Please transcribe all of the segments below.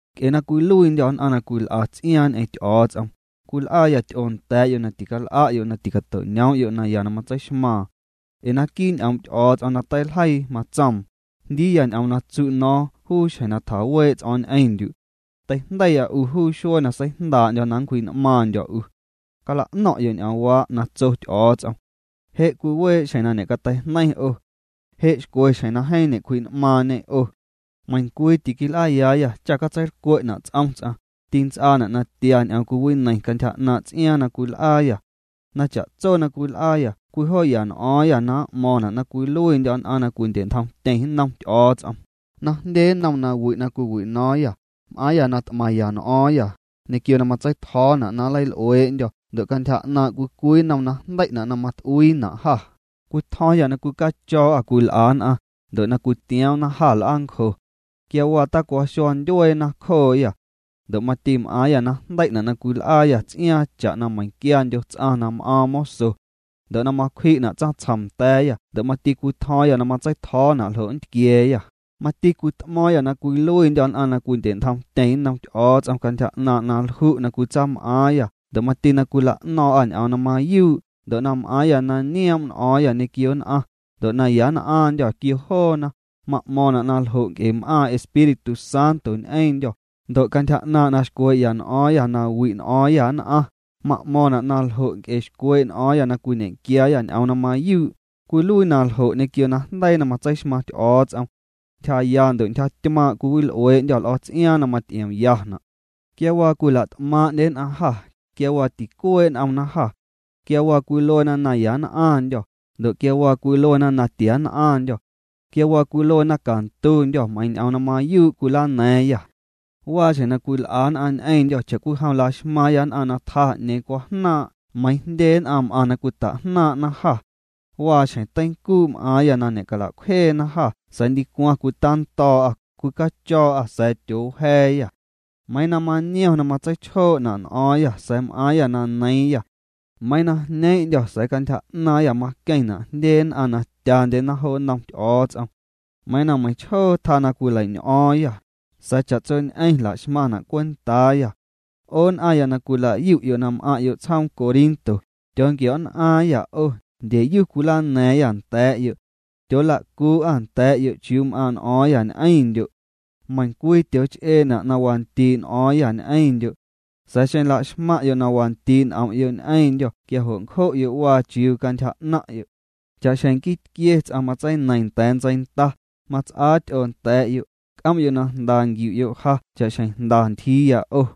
Nc'e na cwiluiindyô̱ nn'aⁿ na cwil'a ts'iaaⁿ ñ'eⁿ Ty'o̱o̱ts'om, cwil'aayâ ty'oo nda̱a̱'yo' na til'a'yo' na ticato'ñoom'yo' naya na matseixmaaⁿ. Ee naquii' ñ'oom' Ty'o̱o̱ts'om na teiljeii matsoom: Jndiiya ñ'oom na tsu' no̱o̱ⁿ juu xjeⁿ na tjawee' ts'o̱o̱ⁿ ñ'eⁿndyu'. Teijndeiya 'u juu xuee na seijndaa'ndyo̱ na nncwji'n'maaⁿndyo̱ 'u. Cala'no̱ⁿ'yo' ñ'oomwaa' na tso Ty'o̱o̱ts'om. Je' cwiwee' xjeⁿ na ñecateijneiⁿ 'o. Je' xcwe xjeⁿ na jeeⁿ ñe'cwji'n'maaⁿñê 'o. Meiⁿcwii tiquil'aayaayâ cha catseilcwe'na' ts'om ts'aⁿ, tints'aana' na tia ñ'oom cwiwineiⁿ cantyja 'naaⁿ' ts'iaaⁿ na cwil'aayâ. Na cha'tso na cwil'aayâ cwijoo'ya n'o̱o̱ⁿyâ na m'mo̱ⁿna' na cwiluiindyô̱ nn'aⁿ na cwindye'ntjomtyeⁿ nnom Ty'o̱o̱ts'om, na jndye nnom nawi' na cwiwino̱o̱ⁿyâ, m'aaⁿyâ na t'maⁿya n'o̱o̱ⁿyâ, ñequio na matseitjo̱o̱na' na nleil'uee'ndyô̱ ndo' cantyja 'naaⁿ' cwii cwii nnom najndei'na' na mat'uiina' jâ, cwitjo̱o̱ⁿyâ na cwicacho̱o̱'â cwil'a nn'aⁿ, ndo' na cwitioomna jâ l'aancjo. Quia waa tacwaxua ndyueena cjooyâ. Ndo' mati m'aaⁿyâ na jndei'na' na cwil'aayâ ts'iaaⁿ cha'na meiⁿquiandyo ts'aⁿ na m'aaⁿ moso. Ndo' na macwji'na' tsaⁿtsjom nda̱a̱yâ ndo' mati cwitjo̱o̱ⁿyâ na matseitjo̱o̱na' ljo' nntquia̱a̱yâ, mati cwit'mo̱o̱ⁿyâ na cwiluiindyô̱ nn'aⁿ na cwindye'ntjomtyeⁿ nnom Ty'o̱o̱ts'om cantyja 'naaⁿ' na lju' na cwitsaam'aaⁿyâ ndo' mati na cwila'no̱ⁿ'â ñ'oom na mayuu' ndo' na m'aaⁿyâ na nioom' n'o̱o̱ⁿyâ ñequio nn'aⁿ, ndo' na ya nn'aⁿndyô̱ quio joona, ma'mo̱ⁿna' na ljo' nc'e m'aaⁿ Espíritu Santo ñ'eⁿndyô̱, ndo' cantyja 'naaⁿ' na xcwee'ya n'o̱o̱ⁿyâ na wi' n'o̱o̱ⁿyâ nn'aⁿ, ma'mo̱ⁿna' na ljo' nc'e xcwee' n'o̱o̱ⁿya na cwiñequiaayâ ñ'oom na mayuu', cwiluii na ljo' ñequio najndeii na matseixmaⁿ Ty'o̱o̱ts'om. Ntyjaya ndo' ntyjatymaⁿ' cwiwil'uee'ndyô̱ l'o̱ts'iaaⁿ na maty'iomyana'. Quia waa cwila't'maaⁿ'ndye nn'aⁿ jâ, quia waa ticuee' n'omna jâ. Quia waa cwiluena na ya nn'aⁿndyô̱, ndo' quia waa cwiluena na tia nn'aⁿndyô̱. Quia waa cwiluena na cantundyô̱ meiiⁿ ñ'oom na mayuu' cwilana̱a̱ⁿyâ. Waa xjeⁿ na cwil'a nn'aⁿ ñ'eⁿndyô̱ cha'cwijom la'xmaaⁿya nn'aⁿ na tjaa 'ñeeⁿ cwajnaaⁿ' meiiⁿ jndye nn'aⁿ m'aⁿ na cwita'jnaaⁿ'na jâ. Waa xjeⁿ teincuu' m'aaⁿya na ñe'cala'cwjeena jâ sa̱a̱ ndicwaⁿ cwitando̱o̱'a, cwicacho̱o̱'â sa̱a̱ tyoowja̱a̱yâ. Meiiⁿ na maniom na matseichjoo'na' n'o̱o̱ⁿyâ sa̱a̱ m'aaⁿyâ na neiiⁿyâ. Meiiⁿ na jneeⁿ'ndyô̱ sa̱a̱ cantyja 'naaⁿyâ maqueⁿna' jndye nn'aⁿ na tyandyena jo nnom Ty'o̱o̱ts'om. Meiiⁿ na meiⁿchjoo tjaa na cwileiñ'o̱o̱ⁿyâ, sa̱a̱ cha'tsoñ'eⁿ la'xmaⁿna' cwentaayâ. 'O nn'aⁿya na cwila'yu'yo' na m'aⁿ'yo' tsjoom Corinto, tyoonquio̱'nn'aaⁿyâ 'o, ndyeyu cwilana̱a̱ⁿyâ nda̱a̱'yo'. Tyoola'cuu'â nda̱a̱'yo' chiuu m'aaⁿ' n'o̱o̱ⁿyâ ñ'eⁿndyo'. Meiⁿcwii tyooch'eena' na wandii' n'o̱o̱ⁿyâ ñ'eⁿndyo'. Sa̱a̱ xeⁿ laxmaⁿ'yo' na wandii' n'om'yo' ñ'eⁿndyô̱ quia jo' ncjo'yo' waa chiuu cantyja 'naⁿ'yo'. Cha'xjeⁿ nquii tquie ts'aⁿ matseineiⁿ nda̱a̱ ntseinda, mats'aa ty'oo nda̱a̱'yo', c'om'yo' na jnda nquiu'yo' ja cha'xjeⁿ jnda ntyjiiya 'o.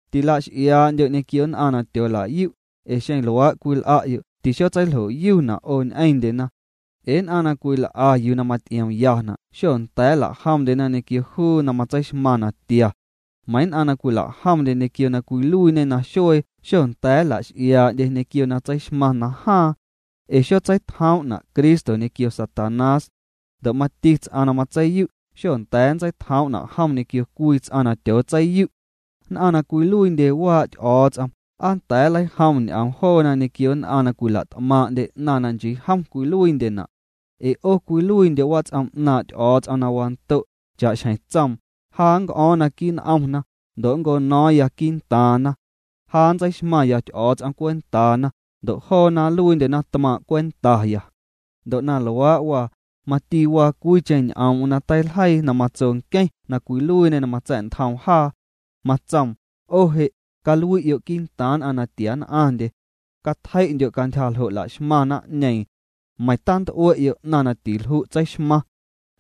Tilax'iaa'ndyo' ñequio nn'aⁿ na tyoolayu', ee xeⁿ luaa' cwil'a'yo' tixotseiljoyuna' 'o ñ'eⁿndyena. Ee nn'aⁿ na cwil'a yuu na maty'iomyana' xonda̱a̱ nlajomndyena ñequio juu na matseixmaⁿ natia. Meiⁿ nn'aⁿ na cwila'jomndye ñequio na cwiluiiñe naxuee xonda̱a̱ nnla'x'iaa'ndye ñequio na tseixmaⁿ najaaⁿ. Ee xotseitjoom'na Cristo ñequio Satanás. Ndo' mati ts'aⁿ na matseiyu', xonda̱a̱ nntseitjoom'na' jom ñequio cwii ts'aⁿ na tyootseiyu'. Nn'aⁿ na cwiluiindye waa' Ty'o̱o̱ts'om, ¿aa nnda̱a̱ nleijom ñ'oom joona ñequio nn'aⁿ na cwila't'maaⁿ'ndye 'naⁿ na nchii jom cwiluiindyena'? Ee 'o cwiluiindyo' wats'om 'naaⁿ' Ty'o̱o̱ts'om na wando', cha'xjeⁿ tsoom: Ja nnc'o̱o̱ⁿ naquii' n'omna, ndo' nncono̱o̱ⁿya quii'ntaaⁿna. Ja nntseixmaⁿya Ty'o̱o̱ts'om cwentaana, ndo' joona nluiindyena tmaaⁿ' cwentaya. Ndo' na luaa' waa, mati waa cwiicheⁿ ñ'oom'm na teiljeii na matso nqueⁿ na cwiluiiñê na matsa̱'ntjoom jaa. Matsoom: 'O je', calui'yo' quii'ntaaⁿ nn'aⁿ na tia nn'aⁿndye. Catjei'ndyo' cantyja ljo' laxmaⁿ naⁿ'ñeeⁿ. Meiⁿ tant'ue'yo' 'naⁿ na tilju' tseixmaⁿ.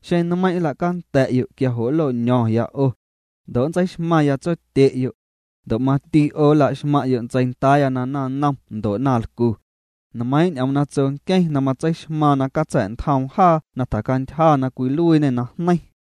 Xeⁿ nmeiⁿ' nla'nda̱'yo' quia jo' nloño̱ⁿya 'o. Ndo' nntseixmaⁿya Tsotye'yo'. Ndo' mati 'o nla'xmaⁿ'yo' ntseindaaya na naⁿnom ndo' naⁿlcu. Nmeiiⁿ' ñ'oom na tso nqueⁿ na matseixmaaⁿ na catsa̱'ntjoom jaa na tjacantyja na cwiluiiñê najneiⁿ.